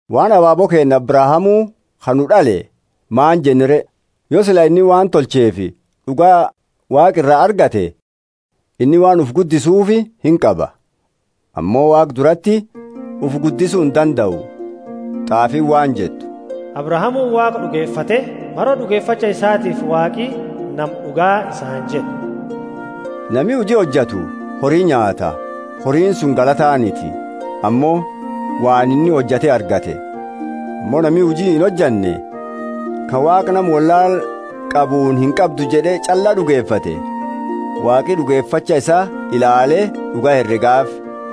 Waan abaabo keenna Abrahamu ka nu d'ale maani jenna re? Yo sila inni waan tolcheefi d'uga Waaqa ira argate inni waan ufi guddisuufi inqaba. Ammo Waaqa durati ufi guddisu indandau. T'aafiini waan jettu, Abrahamuuni Waaqa d'ugefate, maro d'ugefacha isaatiifi Waaqi nama d'uga isaani jed'e. Nami huji hojatu hori nyaata; horiini suni galataaniti, ammo waan inni hojate argate. Ammo nami huji inhojanne, ka Waaqa nama wollaala qabuuni, Inqabdu jed'e ch'alla d'ugefate, Waaqi d'ugefacha isaa ilaale d'uga heregaafi.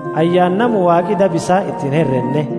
Ayyaana nama Waaqi daba isaa iti inherenne!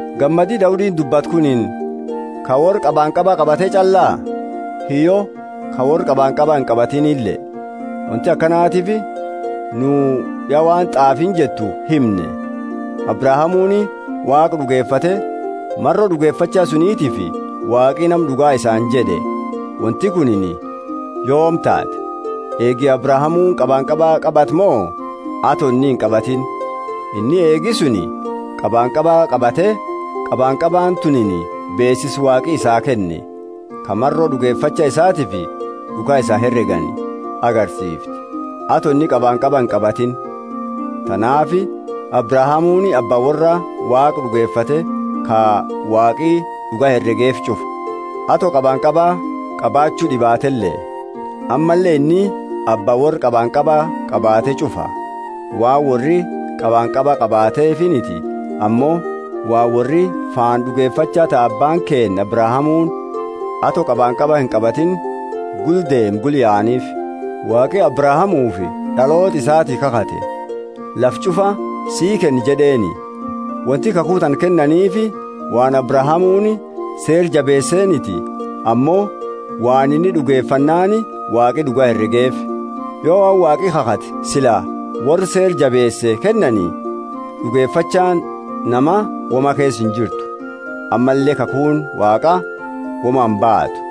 Gammadi Daudiini dubbate kunini ka worra qabanqaba qabate ch'allaa? Hiyyo ka worra qabanqaba inqabatinile. Wonti akanatiifi nu ya waan t'aafiini jettu himne, Abrahamuuni Waaqa d'ugefate, maro d'ugefacha sunitiifi Waaqi nama d'ugaa isaani jed'e. Wonti kunini yoomi taate? Eegi Abrahamuuni qabanqaba qabate mo, ato inni inqabatini? Ato inni inqabatini. Inni eegi suni qabanqaba qabate, qabanqabaani tunini beesisa Waaqi isaa kenne, ka maro d'ugefacha isaatiifi d'uga isaa heregani agarsiifti, ato inni qabanqaba inqabatini. Tanaafi Abrahamuuni Abba worra Waaqa d'ugefate ka Waaqi d'ugaa heregeefi ch'ufa, ato qabanqaba qabachu d'ibaatele. Ammalle inni Abba worra qabanqaba qabate ch'ufa waan worri qabanqaba qabatefiniti, ammo waan worri faana d'ugefacha ta Abbaani keenna Abrahamuuni, ato qabanqaba inqabatini gula deeme gula yaanifi. Waaqi Abrahamufi d'aloota isaati kakhate, Lafa ch'ufa sii kenna jed'eeni, Wonti kakhu tana kennaniifi waan Abrahamuuni Seera jabeeseeniti, ammo waan inni d'ugefannaani Waaqi d'uga heregeefi. Yo waan Waaqi khakhate sila worra seera jabeese kennani, d'ugefachaani nama woma keesa injirtu, ammalle khakhuuni Waaqa woma imbaatu.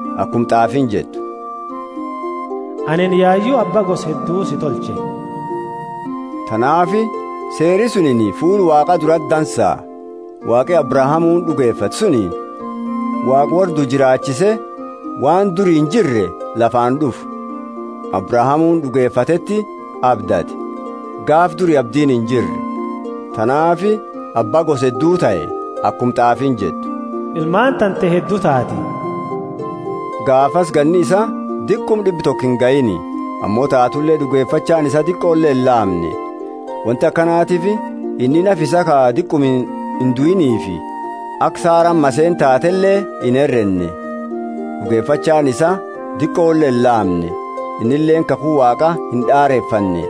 Akuma t'aafiini jettu, Anini yayu abba gosa heddu si tolche. Tanaafi seeri sunini fuula Waaqa durati dansa, Waaqi Abrahamuuni d'ugefate suni Waaqa worra due jiraachise waan duri injirre lafaani d'ufu. Abrahamuuni d'ugefateti abdate, gaafa duri abdiini injirre, tanaafi abba gosa heddu tahe. Akuma t'aafiini jettu, Ilmaani tante heddu taati. Gaafasi ganni isaa diquma d'ibba toko ingahiini ammo taatule d'ugefachaani isaa diqole ilaamne. Wonti akakatiifi inni nafa isaa ka diquma induiinifi aka Saraani maseena taateele inherenne. D'ugefachaani isaa diqole ilaamne, innileeni kakhu Waaqa ind'arefanne,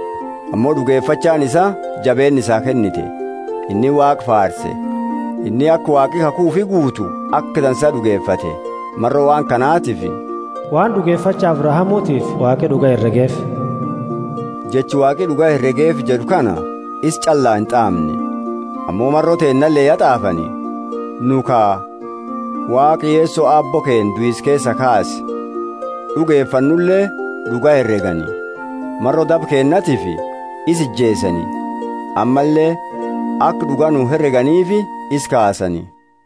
ammo d'ugefachaani isaa jabeenna isaa kennite, inni Waaqa faarse. Inni aka Waaqi khakhu ufi guutu aka dansa d'ugefate. Maro waan kanatifi, waan d'ugefacha Abrahamutiifi, Waaqi d'uga heregeefi. Jecha, Waaqi d'uga heregeefi jed'u kana isa ch'allaa int'aamne. Ammo maro teennale ya t'aafani, nu ka Waaqa, Yeso Aabbo keenna duisa keesaa kaase d'ugefannule d'uga heregani. Maro daba keennatiifi isa ijeesani, ammalle aka d'uga nu hereganiifi isa kaasani.